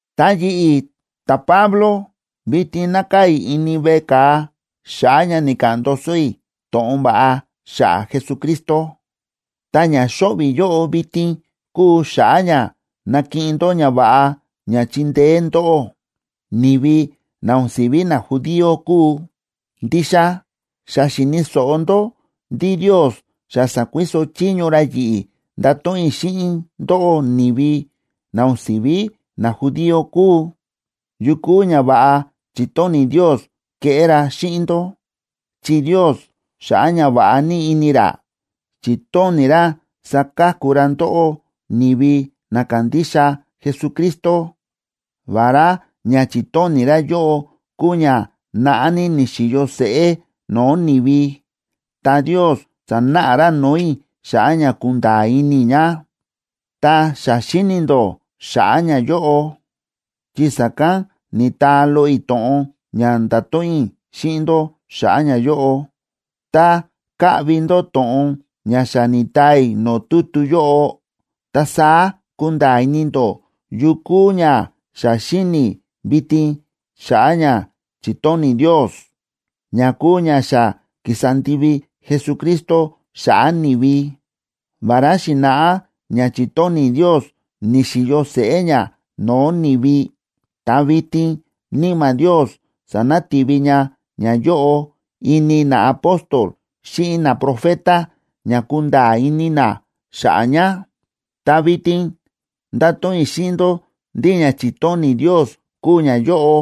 Ta yi̱ꞌi̱, ta̱Pablo, vitin nákaa̱ i̱ ini veꞌe ka̱a xa̱ꞌa̱ ña ni̱ka̱ꞌa̱n ndoso i̱ to̱ꞌon va̱ꞌa xa̱ꞌa̱ Jesucristo. Ta ña xóꞌvi̱ i̱ yóꞌo vitin kúu xa̱ꞌa̱ ña nakiꞌin ndó ñava̱ꞌa ña chindeé ndóꞌó, ni̱vi na o̱n si̱ví najudío kúu. Ndixa xa xi̱ni̱ so̱ꞌo ndó ndí Ndios xa sa̱kuiso chiño ra yi̱ꞌi̱ ndato̱ꞌon i̱ xíꞌin ndóꞌó, ni̱vi na o̱n si̱ví najudío kúu, yu kúu ñava̱ꞌa chi̱tóni̱ Ndios keꞌé ra xíꞌin ndó. Chi Ndios, xa̱ꞌa̱ ñava̱ꞌa ní ini ra, chi̱tóni̱ ra saka̱ku ra ndóꞌó ni̱vi na kándixa Jesucristo. Vará ña chi̱tóni̱ ra yóꞌo kúu ña naꞌá ní ni̱xi̱yo seꞌé no̱o̱ ni̱vi, ta Ndios sa̱náꞌa ra no̱o̱ i̱ xa̱ꞌa̱ ña kunda̱a̱ ini i̱ ña. Ta xa xíni̱ ndó xa̱ꞌa̱ ñayóꞌo chi sa̱kán ni̱taa loꞌo i̱ to̱ꞌon ña nda̱to̱ꞌon i̱ xíꞌin ndó xa̱ꞌa̱ ñayóꞌo. Tá kaꞌvi ndó to̱ꞌon ña xa ni̱taa i̱ no̱o̱ tutu yóꞌo, ta saá kunda̱a̱ ini ndó yu kúu ña xa xíni̱ i̱ vitin xa̱ꞌa̱ ña chi̱tóni̱ Ndios, ña kúu ña xa ki̱sa ndivi Jesucristo xa̱ꞌa̱ ni̱vi. Vará xi̱na̱ꞌá ña chi̱tóni̱ Ndios ni̱xi̱yo seꞌé ña no̱o̱ ni̱vi, ta vitin Níma̱ Ndios sa̱nati̱vi ña ñayóꞌo ini naapóstol xíꞌin naprofeta ña kunda̱a̱ ini na xa̱ꞌa̱ ña. Ta vitin ndáto̱ꞌon i̱ xíꞌin ndó ndí ña chi̱tóni̱ Ndios kúu ñayóꞌo: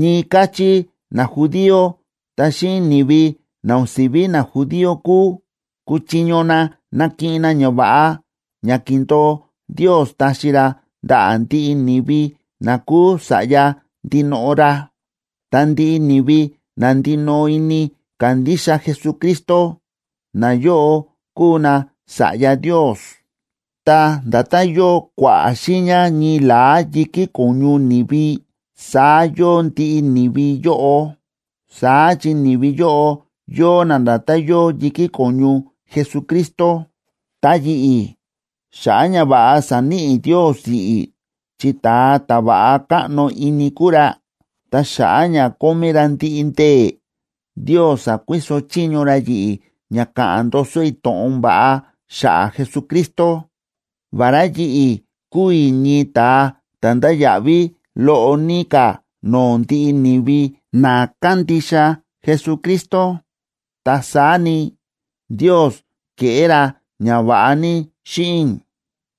Ñii káchí najudío ta xíꞌin ni̱vi na o̱n si̱ví najudío kúu, kúchiño na nakiꞌin na ñava̱ꞌa ña ki̱ndo̱o Ndios taxi ra ndaꞌa̱ ndiꞌi ni̱vi na kúu sa̱ꞌya ndinoꞌo ra. Ta ndiꞌi ni̱vi na ndinoꞌo ini kándixa Jesucristo, nayóꞌo kúu nasa̱ꞌya Ndios, ta nda̱tán yóo kua̱ꞌa̱ xiiña ñii la̱á yi̱kí ko̱ñu ni̱vi saá yóo ndiꞌi ni̱vi yóꞌo, saá chi ni̱vi yóꞌo yóo na nda̱tán yóo yi̱kí ko̱ñu Jesucristo. Ta yi̱ꞌi̱, xa̱ꞌa̱ ñava̱ꞌa sa̱níꞌi Ndios yi̱ꞌi̱ chi ta̱a ta̱ va̱ꞌa káꞌno ini kúu ra, ta xa̱ꞌa̱ ña kómí ra ndiꞌi ndee̱, Ndios sa̱kuiso chiño ra yi̱ꞌi̱ ña ka̱ꞌa̱n ndoso i̱ to̱ꞌon va̱ꞌa xa̱ꞌa̱ Jesucristo. Vará yi̱ꞌi̱ kúu i̱ ñii ta̱a ta̱ ndáya̱ꞌví loꞌo ní ka̱ no̱o̱ ndiꞌi ni̱vi na kándixa Jesucristo, ta saá ni, Ndios ke̱ꞌé ra ñava̱ꞌa ní xíꞌin i̱,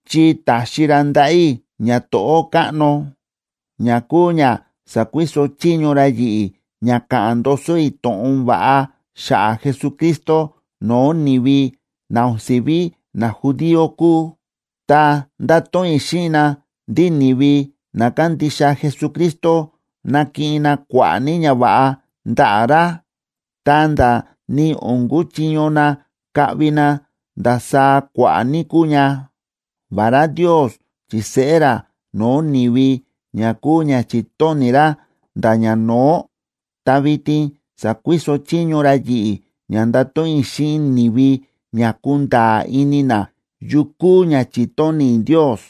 chi ta̱xi ra ndaꞌa̱ i̱ ñato̱ꞌó káꞌno, ña kúu ña sa̱kuiso chiño ra yi̱ꞌi̱ ña ka̱ꞌa̱n ndoso i̱ to̱ꞌon va̱ꞌa xa̱ꞌa̱ Jesucristo no̱o̱ ni̱vi na o̱n si̱ví najudío kúu. Ta ndáto̱ꞌon i̱ xíꞌin na ndí ni̱vi na kándixa Jesucristo nakiꞌin na kua̱ꞌa̱ ní ñava̱ꞌa ndaꞌa̱ ra, ta̱nda̱ ni o̱n kuchiño na kaꞌvi na ndasaá kua̱ꞌa̱ ní kúu ña. Vará Ndios chi̱seꞌé ra no̱o̱ ni̱vi ña kúu ña chi̱tóni̱ ra nda̱ ñano̱ó, ta vitin sa̱kuiso chiño ra yi̱ꞌi̱ ña ndato̱ꞌon i̱ xíꞌin ni̱vi ña kunda̱a̱ ini na yu kúu ña chi̱tóni̱ Ndios,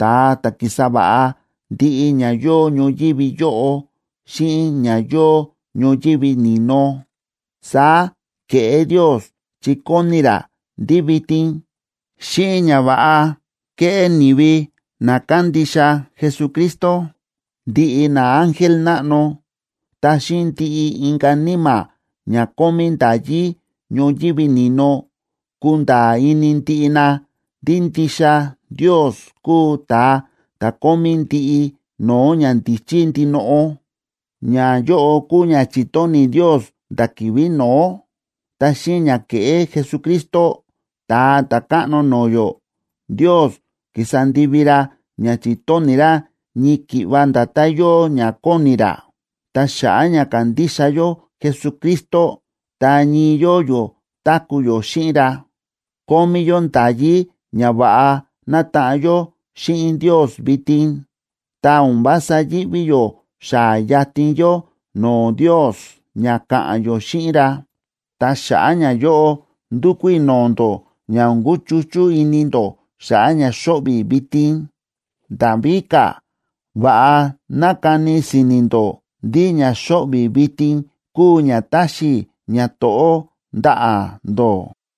ta̱a ta̱ ki̱sa va̱ꞌa ndiꞌi ña yóo ñoyívi yóꞌo xíꞌin ña yóo ñoyívi ni̱no. Saá ke̱ꞌé Ndios chi kóni ra ndí vitin, xíꞌin ñava̱ꞌa kéꞌé ni̱vi na kándixa Jesucristo, ndiꞌi naángel náꞌno ta xíꞌin ndiꞌi inka̱ níma̱ ña kómí nda̱yí ñoyívi ni̱no, kunda̱a̱ ini ndiꞌi na ndí ndixa Ndios kúu ta̱a ta̱ kómí ndiꞌi no̱o̱ ñandíchí ndinoꞌo. Ñayóꞌo kúu ña chi̱tóni̱ Ndios nda̱ ki̱vi̱ no̱ó, ta xíꞌin ña ke̱ꞌé Jesucristo, Ta̱a Ta̱káꞌno no̱o̱ yó, Ndios ki̱sa ndivi ra ña chi̱tóni̱ ra ñii ki̱ꞌva nda̱tán yóo ña kóni ra. Ta xa̱ꞌa̱ ña ka̱ndixa yó Jesucristo ta ñii yóo yó táku̱ yó xíꞌin ra, kómí yó nda̱yí ña va̱ꞌa nataꞌan yó xíꞌin Ndios vitin, ta o̱n vása yíꞌví yó xaa̱ yatin yó no̱o̱ Ndios ña ka̱ꞌa̱n yó xíꞌin ra. Ta xa̱ꞌa̱ ñayóꞌo, ndúkú i̱ no̱o̱ ndó ña o̱n kúchuchú ini ndó xa̱ꞌa̱ ña xóꞌvi̱ i̱ vitin. Nda̱ víka̱, va̱ꞌa ná kani si̱ni̱ ndó ndí ña xóꞌvi̱ i̱ vitin kúu ña táxi i̱ ñato̱ꞌó ndaꞌa̱ ndó.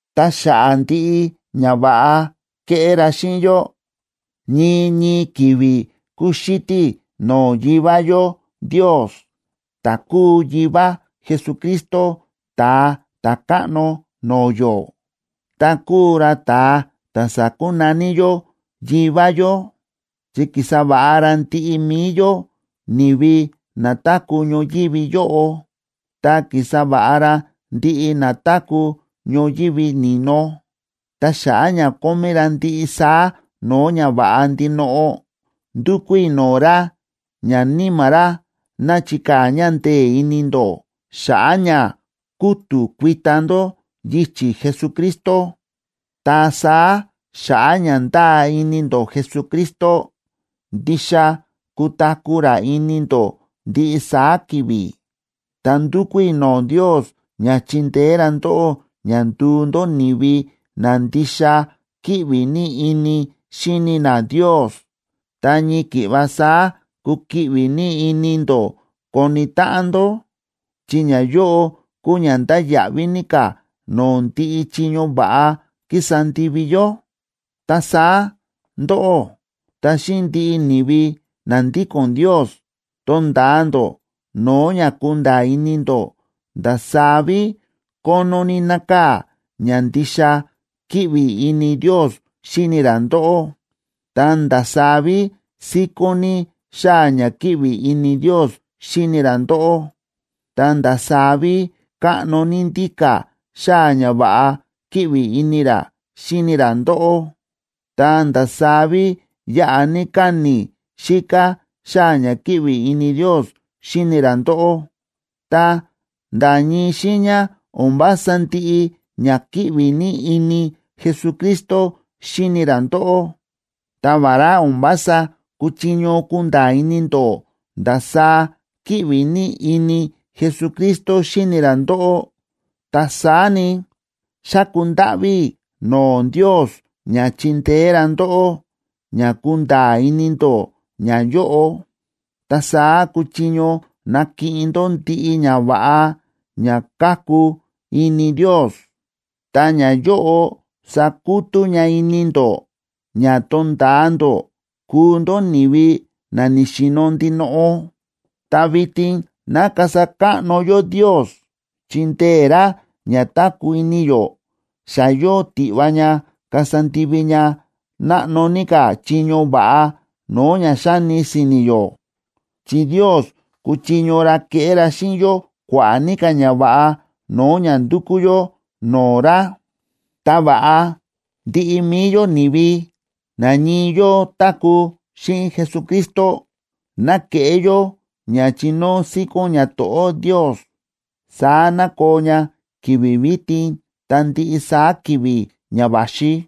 Ta xa̱ꞌa̱ ndiꞌi ñava̱ꞌa ke̱ꞌé ra xíꞌin yó, ñii ñii ki̱vi̱ kúxítí i̱ no̱o̱ Yivá yó Ndios, ta̱ kúu Yivá Jesucristo Ta̱a Ta̱káꞌno no̱o̱ yó, ta kúu ra ta̱a ta̱ sákunaní yó “Yivá yó”, chi ki̱sa va̱ꞌa ra ndiꞌi mi̱i yó, ni̱vi na táku̱ ñoyívi yóꞌo, ta ki̱sa va̱ꞌa ra ndiꞌi na táku̱ ñoyívi ni̱no. Ta xa̱ꞌa̱ ña kómí ra ndiꞌi saá no̱o̱ ñava̱ꞌa ndinoꞌo, ndúkú i̱ no̱o̱ ra ña Níma̱ ra ná chikaa̱ ña ndee̱ ini ndó xa̱ꞌa̱ ña kútu̱ kuita ndó yichi̱ Jesucristo. Ta saá xa̱ꞌa̱ ña ndáa ini ndó Jesucristo, ndixa kutaku̱ ra ini ndó ndiꞌi saá ki̱vi̱. Ta ndúkú i̱ no̱o̱ Ndios ña chindeé ra ndóꞌó ña nduu ndó ni̱vi na ndixa kíꞌvi ní ini xíni na Ndios ta ñii ki̱ꞌva saá kukiꞌvi ní ini ndó koni táꞌan ndó, chi ñayóꞌo kúu ña ndáya̱ꞌví ní ka̱ no̱o̱ ndiꞌi chiño va̱ꞌa kísa ndivi yó. Ta saá ndóꞌó ta xíꞌin ndiꞌi ni̱vi na ndíko̱n Ndios tonda̱a ndó no̱o̱ ña kunda̱a̱ ini ndó ndasaá ví kónó ní nákaa̱ ña ndixa kíꞌvi ini Ndios xíni ra ndóꞌó; ta ndasaá ví síkón ní xáa̱ ña kíꞌvi ini Ndios xíni ra ndóꞌó, ta ndasaá ví káꞌno ní ndíka̱ xáa̱ ña va̱ꞌa kíꞌvi ini ra xíni ra ndóꞌó, ta ndasaá ví yáꞌa ní káni̱ xíká xáa̱ ña kíꞌvi ini Ndios xíni ra ndóꞌó. Ta nda̱ ñii xiiña o̱n vása ndiꞌi ña kíꞌvi ní ini Jesucristo xíni ra ndóꞌó. Ta vará o̱n vása kúchiño kunda̱a̱ ini ndó ndasaá kíꞌvi ní ini Jesucristo xíni ra ndóꞌó, ta saá ni, xáku ndáꞌví i̱ no̱o̱ Ndios ña chindeé ra ndóꞌó ña kunda̱a̱ ini ndó ñayóꞌo. Ta saá kuchiño nakiꞌin ndó ndiꞌi ñava̱ꞌa ña káku ini Ndios, ta ñayóꞌo sakutú ña ini ndó ña tonda̱a ndó kuu ndó ni̱vi na ni̱xi̱no̱ ndinoꞌo. Ta vitin ná kasa káꞌno yó Ndios chi ndee̱ ra ña táku̱ ini yó, xa yóo tiꞌva ña kasa ndivi ña náꞌno ní ka̱ chiño va̱ꞌa no̱o̱ ña xáni si̱ni̱ yó, chi Ndios kúchiño ra keꞌé ra xíꞌin yó kua̱ꞌa̱ ní ka̱ ñava̱ꞌa no̱o̱ ña ndúkú yó no̱o̱ ra. Ta va̱ꞌa ndiꞌi mi̱i yó, ni̱vi na ñii yóo táku̱ xíꞌin Jesucristo, ¡ná keꞌé yó ña chinóo síkón ñato̱ꞌó Ndios! Saá ná koo ña ki̱vi̱ vitin ta ndiꞌi saá ki̱vi̱ ña va̱xi.